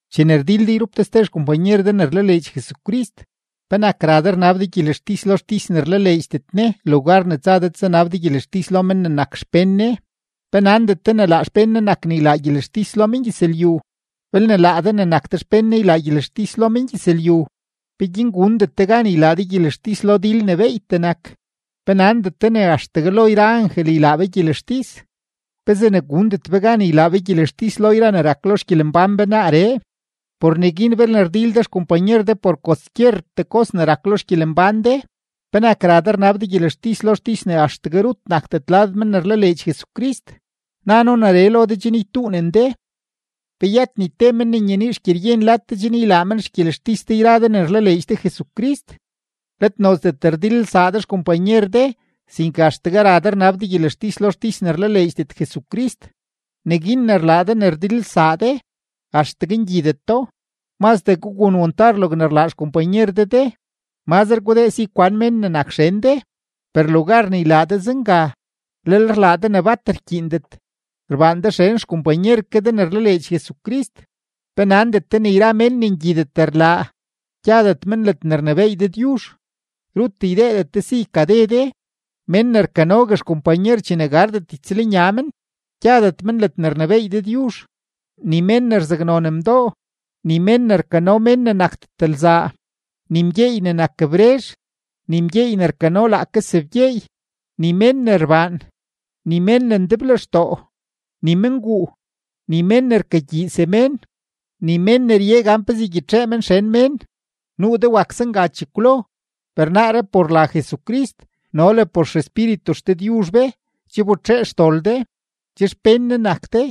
Chene rdil de yrup de ste xkompanyer de ne rlaleedx Jesucrist, ¿penak ra de rnab de gyelextis lo xtis ne rlaleedxdet Ne, lugar ne tsa de tsanab de gyelextis lo men ne nak xpén Ne? ¿Pe nandet de ne laa xpén Ne nak ne ylaa gyelextis lo mengyëzlyu? Belne laa de ne nak de xpén Ne ylaa gyelextis lo mengyëzlyu, ¿peguin gundet de gan ylaa de gyelextis lo dil ne beeytee nak? ¿Pe nandet de ne axtegue lo yra angel ylaa be gyelextis? ¿Pezee ne gundet be gan ne ylaa be gyelextis lo yra ne rak lo xgyelembán be naaree? Por neguin belne rdil de xkompanyer de por kwaskyertee kos ne rak lo xgyelembán de, ¿penak ra de rnab de gyelextis lo xtis ne axtegue rut nakdet lad men ne rlaleedx Jesucrist? Na noo neree lo de chen ytuunen de. ¿Pe yëtet ni te men ne nyenii xgyeryen lad de chen ylaa men xgyelextis de yra de ne rlaleedx de Jesucrist? ¡Let nozdet rdilelsaa de xkompanyer de, sinke axtegue ra de rnab de gyelextis lo xtis ne rlaleedxdet Jesucrist! Neguin ne rlaa de ne rdilelsaa de, axtegue ngyideto. Mazdee gugun wantar logne rlaa xkompanyer de de, mazre gudee si kwan mén ne nak xen de. ¡Per lugar ne ylaa de zenga, lel rlaa de ne bat rkyiindet, rbaan de xen xkompanyer ke de ne rlaleedx Jesucrist! ¿Pe nandet de ne yra mén ne ngyidet rlaa, gyadet men ledne rnebééy Dëdyuzh? Rut ydeedet de si ykade de. Mén ne rkanogue xkompanyer chene gardet ytsëlnya men, gyadet men ledne rnebééy Dëdyuzh, ni mén ne rzaknon mdoo, ni mén ne rkano mén ne nakdet lzaa, ni mgyeey ne nak brezh, ni mgyeey ne rkano laake sebgyeey, ni mén ne rbaan, ni mén ne ndeblextoo, ni menguu, ni mén ne rkagyii semén, ni mén ne rye gan pezee ygyitxee men xen mén. Nuu de wak zenga chekwlo, per naaree por la Jesucrist no le por XEspíritu XDëdyuzh be che wbetxee xdol de, che xpén Ne nak de,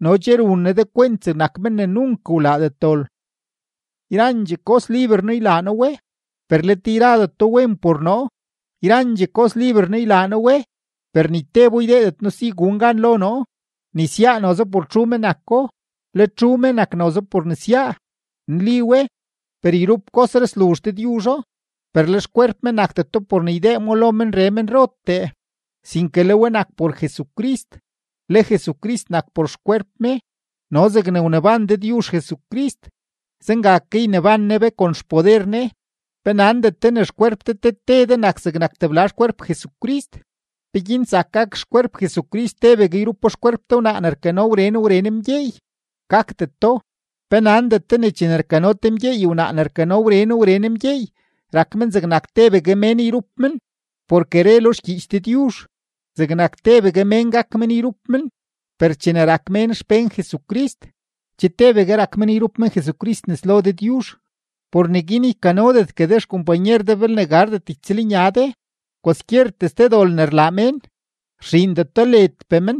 no che run Ne de kwent zegnak men ne nunk wlaadet dol. Yrandxee kos liber noo ylaa noo we, per let yradeto wen por noo. Yrandxee kos liber noo ylaa noo we, per ni tebo ydeedet noo si gun gan lo noo. Nesyaa noze por txu me nako, le txu me nak noze por nesyaa. Nli we, per yrup kosree sluzh Dëdyuzho. Per le xkwerp me nakdeto por ne ydee mo lo menree menrotee, sinke le we nak por Jesucrist, le Jesucrist nak por xkwerp me. No zegne wneban Dëdyuzh Jesucrist, zenga ke yneban Ne be kon xpoder Ne. ¿Pe nandet de ne xkwerp de te te de nak zegnak tebla xkwerp Jesucrist? ¿Peguin zak gak xkwerp Jesucrist tebegue yrupo xkwerp te wnaa ne rkano wren wren mgyeey? ¡Gakdeto! ¿Pe nandet de ne chene rkano te mgyeey wnaa ne rkano wren wren mgyeey, rak men zegnak tebegue mén yrup men? Porke re lo xgyiich Dëdyuzh: “Zegnak tebegue mén gak men yrup men.” Per chene rak mén xpén Jesucrist, che tebegue rak men yrup men Jesucrist nes lo Dëdyuzh. Por neguin ykanodetgue de xkompanyer de belne gardet ytsëlnya de. Kwaskyertee ste dol ne rlaa mén, rxiindeto ledpee men,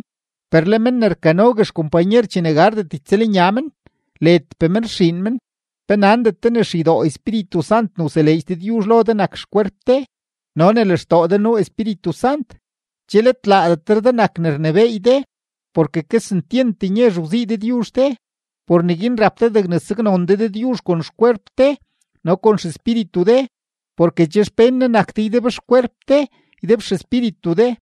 per le men ne rkanogue xkompanyer chene gardet ytsëlnya men, ledpee men rxiin men. ¿Pe nandet de ne xeydoo Espíritu Sant ne wseleedx Dëdyuzh lo de nak xkwerp de no ne lextoo de nuu Espíritu Sant? Che let laadetre de nak ne rnebééy de, porke kesentyent nyezh wzii Dëdyuzh de; por neguin rap de degne saknon de Dëdyuzh kon xkwerp de no kon xespíritu de, porke che xpén Ne nak de ydebxkwerp de, ydebxespíritu de.